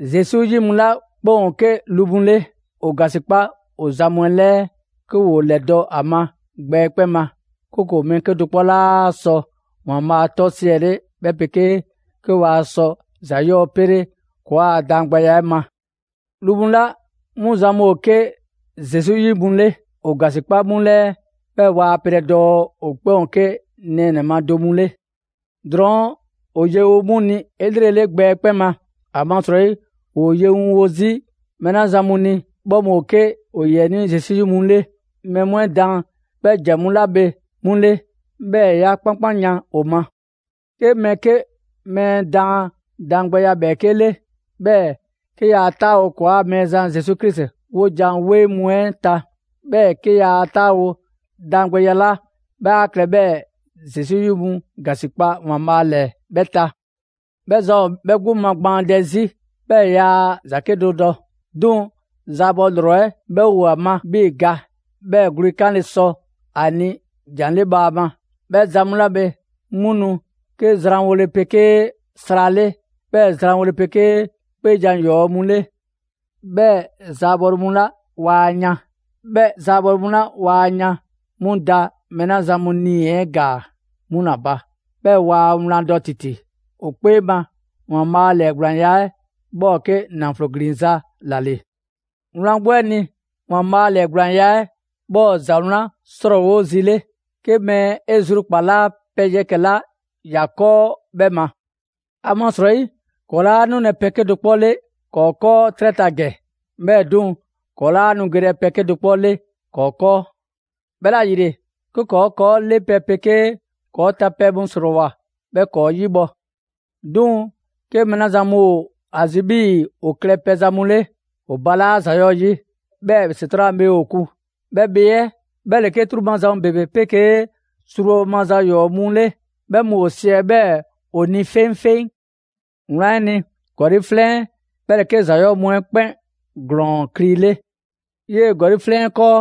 Zesu 'yi mu 'la 'kpɛn ‑o 'ke lu mu 'le, ‑o ‑gasikpa ‑o zan mu 'ɛ 'lɛɛ 'ke ‑woo ‑lɛdɔ' a ma gbɛ 'ɛ 'kpɛn ma; 'kooko‑ mɛɛ 'kedo‑ 'kpɔ 'laa sɔ ‑Waanbhaa' 'tɔ 'ɛ 'siɛle 'bhɛ 'pegee 'ke waa sɔ ‑za 'yɔɔ‑ pele‑ ‑kɔɔa' daangbɛya 'ɛ ma. Lu mu 'la 'mu zan mu ‑o 'ke Zesu 'yi mu 'le, ‑o ‑gasikpa 'mu 'lɛɛ, 'bhɛɛ‑ waa pelɛ dɔɔ ‑o 'kpɛn ‑o 'ke nɛɛnɛ‑ ma do mu 'le. Drɔɔn' ‑o yewo 'mu ni 'elrele gbɛ 'ɛ 'kpɛn ma; ‑amasrɔyi ‑woo yewo 'zi mɛɛ 'la zan mu ni, 'bhɛ mu ‑o 'ke ‑o ‑yiɛnii' Zesu 'yi mu 'le. Mɛɛ mu 'ɛ daan 'bhɛ ‑jan mu 'la bhe 'mu ‑le, 'bhɛɛ‑ 'ya 'kpankpanyan ‑o ma. 'Ke mɛɛ 'ke mɛɛ mu daan daangbɛya 'bhɛɛke 'le, 'bhɛɛ‑ 'ke yaa 'taawo‑ ‑kɔɔa' Mɛɛzan Zesu Krisi 'wojan‑ 'weŋ mu 'ɛ ta, 'bhɛɛ‑ 'ke yaa 'taawo‑ daangbɛya 'la 'bhɛ 'a klɛ 'bhɛɛ‑ Zesu 'yi mu ‑gasikpa ‑Waanbhaa' ‑lɛɛ 'bhɛ ta, 'bhɛ zan ‑o 'bhɛ 'gbu magbaandɛ 'zi, 'bhɛɛ‑ yaa ‑za 'kedo‑ dɔ. 'Duŋ‑ zaabɔ ‑lrɔ 'ɛ 'bhɛ ‑o ‑a ma 'bhii‑ ga, 'bhɛɛ‑ gwle 'kanle sɔ ‑a ni jan 'le bhaama. 'Bhɛ ‑za mu 'la bhe, 'mu nu 'ke zranwole 'pegee sra 'le, 'bhɛɛ‑ ‑zwanwole 'pegee 'kpee jan ‑yɔɔ' mu 'le; 'bhɛɛ‑ zaabɔle mu 'la waa yan. 'Bhɛ zaabɔle mu 'la waa yan 'mu da mɛɛ la zan mu 'nii‑ 'ɛ ‑gaa, 'mu ‑la ba; 'bhɛɛ‑ waa wlan dɔ ‑titi. ‑O 'kpee ma, ‑Waanbhaa' ‑lɛɛgblaanya 'ɛ 'bhɛ ‑o 'ke ‑naflo ‑glinza' ‑la ‑le. Wlan 'gbu 'ɛ ni, ‑Waanbhaa' ‑lɛɛgblaanya 'ɛ 'bhɛ ‑o ‑za 'wlan 'srɔɔwo zi 'le, 'ke mɛɛ 'e zru ‑kpalaa' pɛ yɛkɛ‑ 'la ‑ya 'kɔɔ 'bhɛ ma. ‑Amasrɔyi ‑kɔɔ' 'laa nulɛ pɛ 'kedo‑ 'kpɔ 'le ‑kɔɔ' 'kɔɔ 'trɛ ta ‑gɛ, 'bhɛɛ‑ 'duŋ‑ ‑kɔɔ' 'laa nu gelɛ pɛ 'kedo‑ 'kpɔ 'le ‑kɔɔ' 'kɔɔ. 'Bhɛla‑ ‑yile, 'ke ‑kɔɔ' ‑kɔɔ' 'le pɛle 'pegee ‑kɔɔ' ta pɛ mu ‑srɔɔwoa 'bhɛ ‑kɔɔ' 'yibhɔ‑. 'Duŋ‑ 'ke mɛɛ 'la zan mu ‑o ‑a zi 'bhii‑ ‑o klɛ pɛzan mu 'le, ‑o balaa' ‑za 'yɔɔ‑ 'yi, 'bhɛɛ ‑Setran' a bhee ‑o kun. 'Bhɛ bhee 'ɛ 'bhɛ ‑le 'ke 'truu‑ maza mu ‑bebe 'pegee zrubhɔ maza 'yɔɔ‑ mu 'le; 'bhɛ mu ‑o siɛ 'bhɛɛ‑ ‑o ni 'feŋfeŋ. Wlan 'ɛ ni, ‑gɔli' 'flɛn 'ɛ 'bhɛ ‑le 'ke ‑za 'yɔɔ‑ mu 'ɛ 'kpɛn ‑glɔɔn kli 'le. 'Yee‑ ‑gɔli' 'flɛn 'ɛ 'kɔɔ,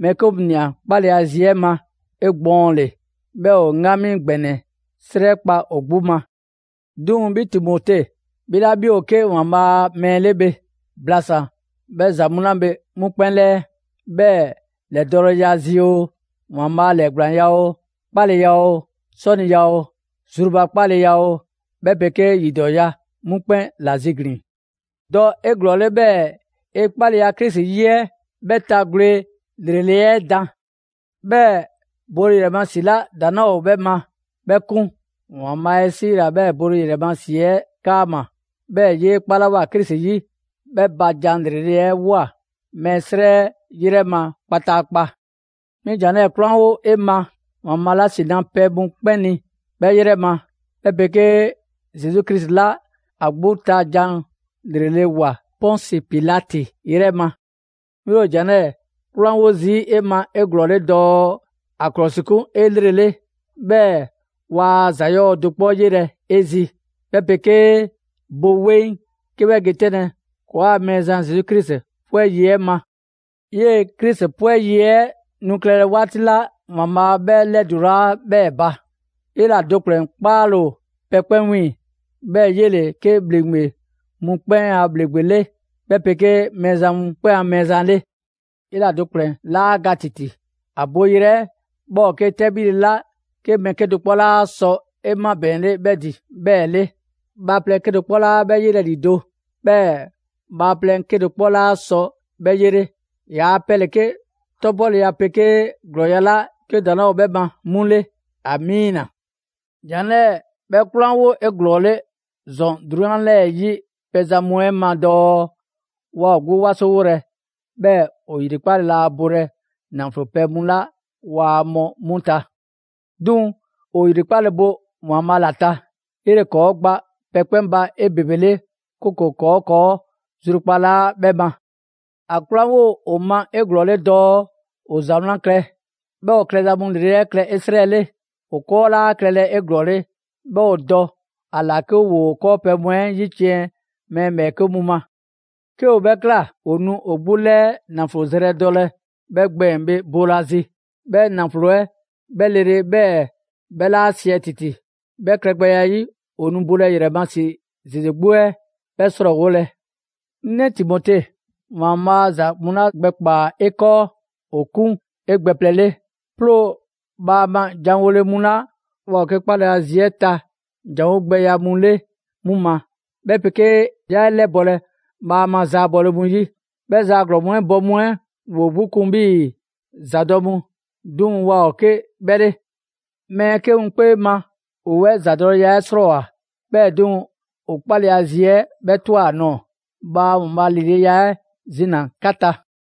mɛɛ 'ke mu ꞊nia 'kpaleya zi 'ɛ ma 'egbɔɔnle; 'bhɛɛ‑ ‑o 'ŋgami ‑gbɛnɛ 'srɛ kpa ‑o 'gbu ma. 'Duŋ‑ 'bhi Timote, 'bhi 'la 'bhi ‑o 'ke ‑Waanbhaa' a mɛɛ 'le bhe, blasan‑ 'bhɛ ‑za mu 'la bhe 'mu 'kpɛn 'lɛɛ. 'Bhɛɛ‑ ‑lɛdɔɔleya zi oo, ‑Waanbhaa' ‑lɛɛgblaanya oo, 'kpaleya oo, 'sɔniya oo, zrubakpaaleya oo, 'bhɛ 'pegee ‑yidɔɔya 'mu 'kpɛn ‑la ziglin‑. Dɔ 'eglɔɔle 'bhɛɛ‑ 'e 'kpaleya Krisi 'yi 'ɛ 'bhɛ ta gwle ‑lrele' 'ɛ dan. 'Bhɛɛ‑ bole ‑yrɛ ma ‑si 'la ‑daŋ' 'laa ‑o 'bhɛ ma 'bhɛ 'kun. ‑Waanbhaa' 'e 'siila‑ 'bhɛɛ‑ bole ‑yrɛ ma ‑si 'ɛ 'kaama‑; 'bhɛɛ‑ 'yee 'kpalawoa Krisi 'yi 'ɛ 'bhɛ ba jan ‑lrele' ꞊woa mɛɛ 'srɛ 'yrɛ ma kpataakpa. 'Mi jan 'lɛɛ‑ 'kwlanwo‑ 'e ma ‑Waanbhaa' 'la ‑si na pɛ mu 'kpɛn ni, 'bhɛ 'yrɛ ma; 'bhɛ 'pegee Zesu Krisi 'la ‑a 'gbu ta ‑jan 'lrele‑ ‑woa Pɔnsi Pitalti 'yrɛ ma. 'Mi ‑o ‑jan 'lɛɛ‑ 'kwlanwo zii' 'e ma 'eglɔɔle dɔɔ ‑a ‑klɔsikun 'elrele, 'bhɛɛ‑ waa ‑za 'yɔɔ‑ do 'kpɔ 'yelɛ‑ 'e zi, 'bhɛ 'pegee bo 'weŋ 'ke 'bhɛ ge 'tɛnle‑ ‑kɔɔa' Mɛɛzan Zesu Krisi 'pwɛ yi 'ɛ ma. 'Yee Krisi 'pwɛ yi 'ɛ nu klɛlɛ 'waati 'la ‑Waanbhaa' 'bhɛ 'lɛdulaa 'bhɛɛ‑ ba. 'Yela‑ do ‑kplɛn 'kpaale‑ ‑o pɛ 'kpɛn 'wiiŋ‑, 'bhɛɛ‑ 'yele‑ 'ke ‑bhleŋgbe mu 'kpɛn a ‑bhleŋgbe 'le, 'bhɛ 'pegee Mɛɛzan mu 'kpɛn a Mɛɛzan 'le. 'Yela‑ do ‑kplɛn 'laa ga ‑titi; ‑a boyrɛ 'ɛ 'bhɛ ‑o 'ke 'tɛbhile 'la 'ke mɛɛ 'kedo‑ 'kpɔ 'laa sɔ 'e 'mabɛɛnle 'bhɛ ‑din 'bhɛɛ‑ 'le. Bhaaplɛŋ 'kedo‑ 'kpɔ 'laa 'bhɛ 'yelɛ‑ ‑lido', 'bhɛɛ‑ bhaaplɛŋ 'kedo‑ 'kpɔ 'laa sɔ 'bhɛ 'yele. ‑Yaa' pɛ ‑le 'ke 'tɔbhɔleya 'pegee ‑glɔɔya' 'la 'ke ‑daŋ' 'laa ‑o 'bhɛ ma 'mu 'le! Amiina! ‑Jan 'lɛɛ‑ 'bhɛ 'kwlanwo 'eglɔɔle ‑zɔn 'drunyan 'lɛɛ‑ 'yi pɛzan mu 'ɛ ma dɔɔ waa ‑o 'gbu 'wasowolɛ, 'bhɛɛ‑ ‑o ‑yrikpale laa bolɛ ‑naflo pɛ mu 'la waa mɔ 'mu ta; 'duŋ‑ ‑o ‑yrikpale bo ‑Waanbhaa' ‑la ta. 'Yele‑ ‑kɔɔ' gba pɛ 'kpɛn ba 'ebebele, 'kooko‑ ‑kɔɔ' ‑kɔɔ' zrukpalaa 'bhɛ ma. ‑A 'kwlanwo ‑o ma 'eglɔɔle dɔɔ ‑o ‑za 'wlan klɛ, 'bhɛɛ‑ ‑o klɛza ‑lrele' mu 'ɛ klɛ 'esrɛle; ‑o 'kɔɔ 'laa klɛlɛ 'eglɔɔle, 'bhɛɛ‑ ‑o dɔ ‑a ‑la 'ke ‑woo 'kɔɔpɛ‑ mu 'ɛ 'yiciɛn‑ mɛɛ ‑bhɛɛke' mu ma. 'Ke ‑o 'bhɛ ꞊kla, ‑o nu ‑o 'gbu ‑lɛɛ ‑naflo zrɛ dɔlɛ 'bhɛ gbɛɛn‑ bhe boolazi; 'bhɛ ‑naflo 'ɛ 'bhɛ lele 'bhɛɛ‑ 'bhɛ 'laa 'siɛ ‑titi. 'Bhɛ klɛgbɛya 'ɛ 'yi, ‑o nu bole ‑yrɛ ma ‑si ‑zeze 'gbu 'ɛ 'bhɛ 'srɔɔwolɛ. 'Ŋ 'nɛ Timote, ‑Waanbhaa' ‑za mu 'la gbɛkpaa‑ 'e 'kɔɔ, ‑o 'kun 'e gbɛ plɛ 'le. 'Ploo‑ bhaama ‑janwole mu 'la waa ‑o 'ke 'kpaleya zi 'ɛ ta janwo gbɛya mu 'le 'mu ma; 'bhɛ 'pegee 'yaa 'e 'lɛbɔlɛ bhaama zaabɔle mu 'yi; 'bhɛ zaa ‑glɔɔn 'ɛ bɔ mu 'ɛ ‑woo 'gbu 'kun 'bhii‑ ‑zadɔ' mu, 'duŋ‑ waa ‑o 'ke 'bhɛ 'le. Mɛɛ 'ke mu 'kpee ma ‑o 'bhɛ ‑zadɔleya 'ɛ 'srɔɔwoa‑, 'bhɛɛ‑ 'duŋ‑ ‑o 'kpaleya zi 'ɛ 'bhɛ ꞊twa ‑a nɔɔ‑. Bhaa ‑Waanbhaa' ‑lileya 'ɛ zina‑ 'ka ta!